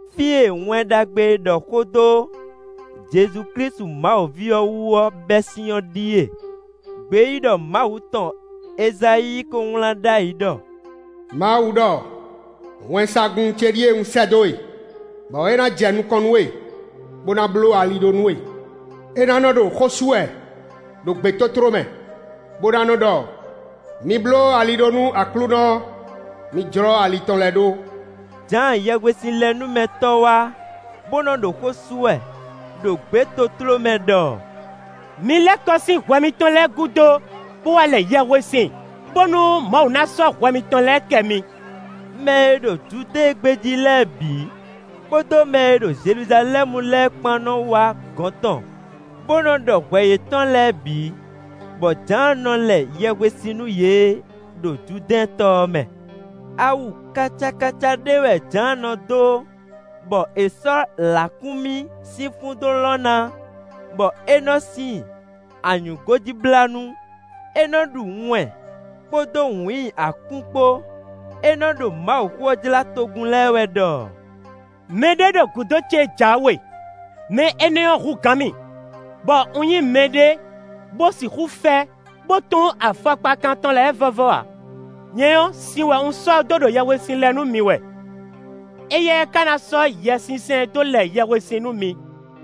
Fí e Wɛn Ɖagbe e ɖɔ xó dó Jezu Klísu Mawu ví ɔ́ wú ɔ́ bɛ́ sín ɔ́ ɖíe. Gbeyíɖɔ Mawu tɔn Ezayíi ko wlán ɖ'ayǐ ɖɔ: “Mawu ɖɔ: ‘Wɛnsagun ce ɖíe un sɛ́ dó e, bɔ é ná jɛ nukɔn nú we, bó ná bló ali ɖó nú we.’ É ná nɔ́ ɖo xó sú wɛ ɖo gbětótló mɛ, bó ná nɔ́ ɖɔ: ‘Mi bló ali ɖó nú Aklúnɔ, mi jlɔ́ ali tɔn lɛ́ɛ ɖó.’” Jǎan Yɛhwesinlɛnúmɛtɔ́ wá, bó nɔ́ ɖo xó sú wɛ ɖo gbětótló mɛ ɖɔ: “Mi lɛ́ kɔ sín hwɛ mitɔn lɛ́ɛ gúdo, bó wá lɛ yɛhwesin, bónú Mawu ná sɔ́ hwɛ mitɔn lɛ́ɛ kɛ mi.” Mɛ e ɖo Judée gbé jí lɛ́ɛ bǐ, kpódó mɛ e ɖo Jeluzalɛ́mu lɛ́ɛ kpán nɔ́ wá gɔ̌n tɔn, bó nɔ́ ɖɔ hwɛ yětɔn lɛ́ɛ bǐ, bɔ Jǎan nɔ lɛ yɛhwesin nú yě ɖo Judɛ́ɛn tɔ ɔ́ mɛ. Awu kacakaca ɖé wɛ Jǎan nɔ dó, bɔ è sɔ́ lǎkúnmí sín fún dó lɔn ná, bɔ é nɔ́ sin anyǔgójíblánú. É nɔ́ ɖu wɛn kpódó wǐin akú kpó. É nɔ́ ɖo Mawuxó ɔ́ jlá togun lɛ́ɛ wɛ ɖɔ: “Mɛ ɖé ɖo gǔdo ce jǎwe; mɛ énɛ́ ɔ́ hú gǎn mì, bɔ un nyí mɛɖé bó sixú fɛ, bó tún afɔkpakan tɔn lɛ́ɛ vɔ́vɔ́ ǎ. Nyɛ ɔ́, sin wɛ un sɔ́ dó ɖo yɛhwesin lɛ nú mi wɛ; éyɛ́ ká ná sɔ́ Yɛsinsɛn dó lɛ yɛhwesin nú mi.”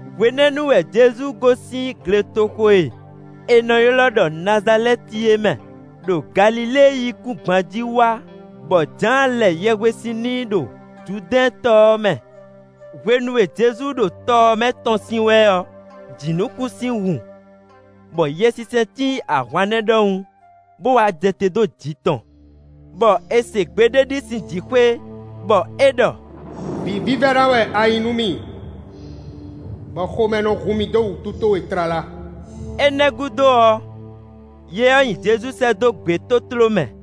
Hwenɛ́nu wɛ Jezu gosín gletoxo e è nɔ ylɔ́ ɖɔ Nazalɛ́ti é mɛ, ɖo Galilée yíkúngban jí wá, bɔ Jǎan lɛ yɛhwesin n'i ɖo Judɛ́ɛn tɔ ɔ́ mɛ. Hwenu e Jezu ɖo tɔ ɔ́ mɛ tɔ́n sín wɛ ɔ́ jǐnukúnsin hun, bɔ Yɛsinsɛn cí ahwannɛ́ ɖɔhun bó wá jɛ te dó jǐ tɔn. Bɔ è se gbe ɖé sín jǐxwé, bɔ é ɖɔ: “Vǐ vívɛ́ná wɛ a nyǐ nú mì, bɔ xomɛ nɔ hun mì dó wǔtu towe tlala.” Énɛ́ gúdo ɔ́, Yɛ ɔ́ nyi Jezu sɛ́ dó gbětótló mɛ.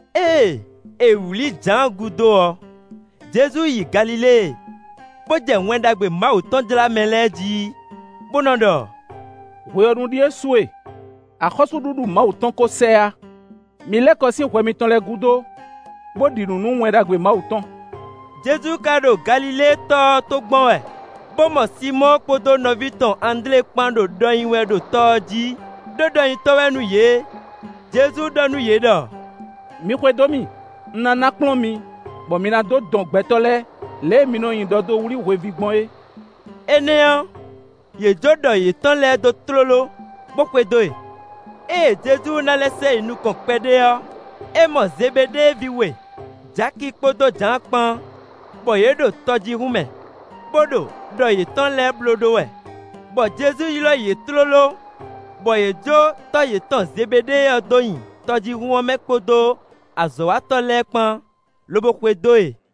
Ée è wlǐ Jǎan gúdo ɔ́, Jezu yi Galilée, bó jɛ Wɛn Ɖagbe Mawu tɔn jlá mɛ lɛ́ɛ jí, bó nɔ́ ɖɔ: “Hwe ɔ́ nu ɖíe su e. Axɔ́súɖuɖu Mawu tɔn kó sɛ yá. Mi lɛ́ kɔ sín hwɛ mitɔn lɛ́ɛ gúdo, bó ɖi nǔ nú Wɛn Ɖagbe Mawu tɔn.” Jezu ka ɖo Galilée tɔ ɔ́ tó gbɔn wɛ, bó mɔ Sinmɔ́ɔ kpódó nɔví tɔn Andlé kpán ɖo ɖɔ nyi wɛ ɖo tɔ ɔ́ jí; ɖó ɖɔnyitɔ́ wɛ nú yě. Jezu ɖɔ nú yě ɖɔ: “Mi xwedó mì. Un ná ná kplɔ́n mi, bɔ mi ná nɔ́ dɔn gbɛtɔ́ lɛ́ɛ, lě e mi nɔ nyi ɖɔ dó wlí hweví gbɔn é.” Énɛ́ ɔ́, yě jó ɖɔ yětɔn lɛ́ɛ dó tlóló, bó xwedó e. Ée Jezu ná lɛ́ sɛ yi nukɔn kpɛɖé ɔ́, é mɔ Zebeɖée ví we: Jaki kpódó Jǎan kpán, bɔ yě ɖo tɔjíhún mɛ, bó ɖo ɖɔ yětɔn lɛ́ɛ blóɖó wɛ, bɔ Jezu ylɔ́ yě tlóló, bɔ yě jó tɔ́ yětɔn Zebeɖée ɔ́ dó nyi tɔjíhún ɔ́ mɛ kpódó azɔ̌watɔ́ lɛ́ɛ kpán, lobo xwedó e.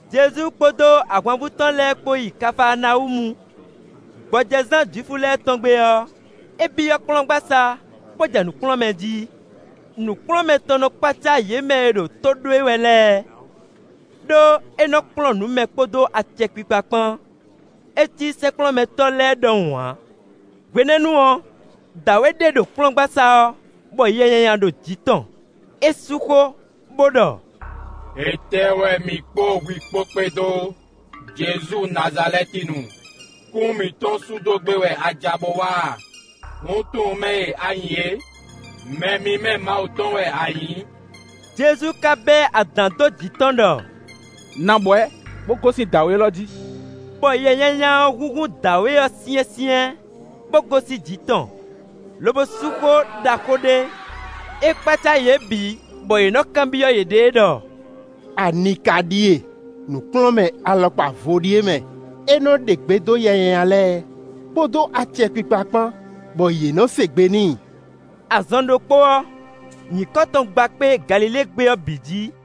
Jezu kpódó ahwanvú tɔn lɛ́ɛ kpó yi Kafaanawúmu; gbɔjɛzán Jwifu lɛ́ɛ tɔn gbe ɔ́, é byɔ́ kplɔ́ngbasá, bó jɛ nǔ kplɔ́n mɛ jí. Nǔkplɔ́nmɛ tɔn nɔ kpácá yě mɛ e ɖo tó ɖó e wɛ lɛ́ɛ, ɖó é nɔ kplɔ́n nǔ mɛ kpódó acɛkpikpa kpán; é cí sɛ́nkplɔ́nmɛtɔ́ lɛ́ɛ ɖɔhun ǎ. Hwenɛ́nu ɔ́, dǎwe ɖé ɖo kplɔ́ngbasá ɔ́, bɔ yɛ nyanya ɖo jǐ tɔn; é sú xó, bó ɖɔ: “Étɛ́ wɛ mǐ kpó hwi kpó kpédó, Jezu Nazalɛ́tinu? Kún mǐtɔn sú dó gbé wɛ a ja bo wá a? Un tunwun mɛ e a nyǐ é; mɛ mímɛ́ Mawu tɔn wɛ a nyǐ.” Jezu ka bɛ́ adǎn dó jǐ tɔn ɖɔ: “Nɔ abwɛ̌, bó gosín dǎwe élɔ́ jí.” Bɔ yɛ nyanya ɔ́ húnhún dǎwe ɔ́ syɛ́nsyɛ́n, bó gosín jǐ tɔn, lobo sú xó ɖaxó ɖé. É kpácá yě bǐ bɔ yě nɔ́ kanbyɔ́ yěɖée ɖɔ: “Ani ka ɖíe? Nǔkplɔ́nmɛ alɔkpa vo ɖíe mɛ! É nɔ́ ɖe gbe dó yɛ nyanya lɛ́ɛ, kpódó acɛkpikpa kpán, bɔ yě nɔ́ se gbe n'i.” Azɔn ɖokpó ɔ́, nyǐkɔ tɔn gba kpé Galilée gbé ɔ́ bǐ jí.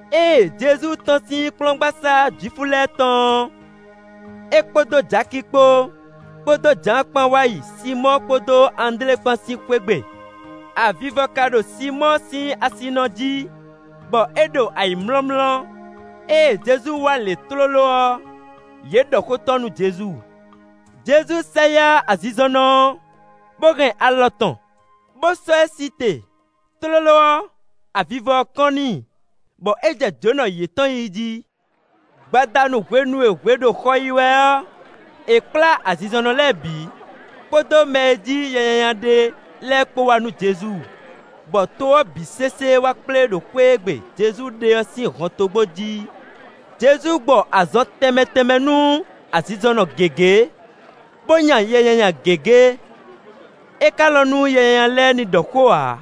Ée Jezu tɔ́n sín kplɔ́ngbasá Jwifu lɛ́ɛ tɔn ɔ́, é kpódó Jaki kpó, kpódó Jǎan kpán wá yi Sinmɔ́ɔ kpódó Andlé kpán sín xwé gbe. Avivɔ ka ɖo Sinmɔ́ɔ sín asinɔ jí, bɔ é ɖo ayǐmlɔ́mlɔ́; ée Jezu wá lě tlóló ɔ́, yě ɖɔ xó tɔn nú Jezu. Jezu sɛ yá azinzɔnnɔ ɔ́, bó hɛn alɔ tɔn, bó sɔ́ ɛ sí te; tlóló ɔ́, avivɔ ɔ́ kɔ́n n'i, bɔ é jɛ jǒnɔ yětɔn yí jí. Gbadanu hwenu e hwe ɖo xɔ yi wɛ ɔ́, è kplá azinzɔnnɔ lɛ́ɛ bǐ, kpódó mɛ e jí yɛ nyanya ɖe lɛ́ɛ kpó wá nú Jezu, bɔ to ɔ́ bǐ sésé wá kplé ɖo xwé e gbe Jezu ɖe ɔ́ sín hɔntogbó jí. Jezu gbɔ azɔn tɛnmɛ tɛnmɛ nú azinzɔnnɔ gěgé, bó nya yɛ nyanya gěgé. É ka lɔn nú yɛ nyanya lɛ́ɛ ní ɖɔ xó ǎ,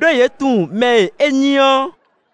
ɖó yě tunwun mɛ e é nyí ɔ́.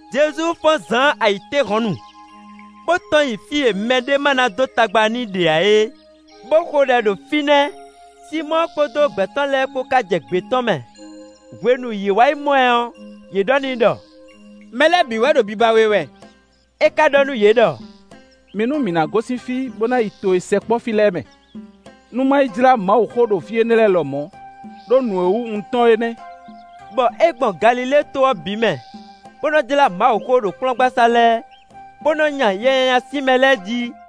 Jezu fɔ́n zǎn ayǐtéhɔ̌nnu, bó tɔ́n yi fí e mɛɖé ma ná dó tagba n'i ɖe ǎ é, bó xo ɖɛ ɖo fínɛ́. Sinmɔ́ɔ kpódó gbɛ̌ tɔn lɛ́ɛ kpó ká jɛ gbě tɔn mɛ. Hwenu e yě wá yi mɔ ɛ ɔ́, yě ɖɔ n'i ɖɔ: “Mɛ lɛ́ɛ bǐ wɛ ɖo biba we wɛ.” É ka ɖɔ nú yě ɖɔ: “Mi nú mǐ ná gosín fí bó ná yi to e sɛkpɔ́ fí lɛ́ɛ mɛ, nú má yi jlá Mawuxó ɖo fí énɛ́ lɛ́ɛ lɔmɔ̌, ɖó nǔ e wú un tɔ́n é nɛ́.” Bɔ é gbɔn Galilée to ɔ́ bǐ mɛ, bó nɔ́ jlá Mawuxó ɖo kplɔ́ngbasá lɛ́ɛ, bó nɔ́ nya yɛ nyanya sín mɛ lɛ́ɛ jí.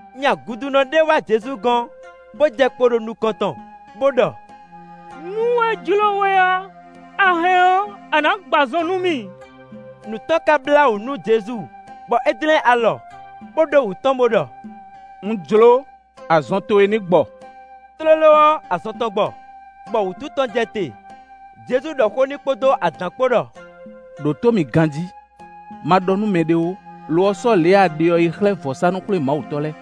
Nya gudunɔ ɖé wá Jezu gɔ́n, bó jɛ kpo ɖo nukɔn tɔn, bó ɖɔ: “Nú é jló we ɔ́, a hɛn ɔ́, a nǎ gbɔ azɔn nú mì.” Nǔ tɔn ka blá wǔ nú Jezu, bɔ é dlɛ́n alɔ, bó ɖó wǔ tɔn bó ɖɔ: “Un jló, azɔn towe ní gbɔ.” Tlóló ɔ́, azɔn tɔn gbɔ, bɔ wútu tɔn jɛ te. Jezu ɖɔ xó n'i kpódó adǎn kpó ɖɔ: “Đǒtó mì ganjí! Ma ɖɔ nú mɛɖé ó; lo ɔ́, sɔ́ lě e a ɖe ɔ́ yi xlɛ́ vɔ̌sánú-xwlémawutɔ́ lɛ́ɛ,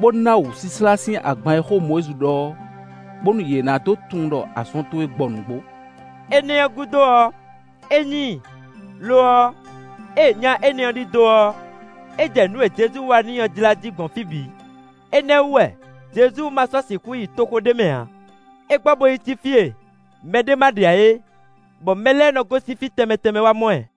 bó ná wǔsláslá sín agban e xó Mɔyízi ɖɔ ɔ́, bónú yě ná dó tunwun ɖɔ azɔn towe gbɔ nǔgbó.” Énɛ́ ɔ́ gúdo ɔ́, é nyi i. Lo ɔ́, ée nya énɛ́ ɔ́ ɖidó ɔ́, é jɛ nǔ e Jezu wa n'i ɔ́ jlá jí gbɔn fí bǐ; énɛ́ ɔ́ wú wɛ Jezu ma sɔ́ sixú yi toxo ɖé mɛ ǎ. É gbɔ bó yi cí fí e mɛɖé ma ɖe ǎ é, bɔ mɛ lɛ́ɛ nɔ gosín fí tɛnmɛ tɛnmɛ wá mɔ ɛ.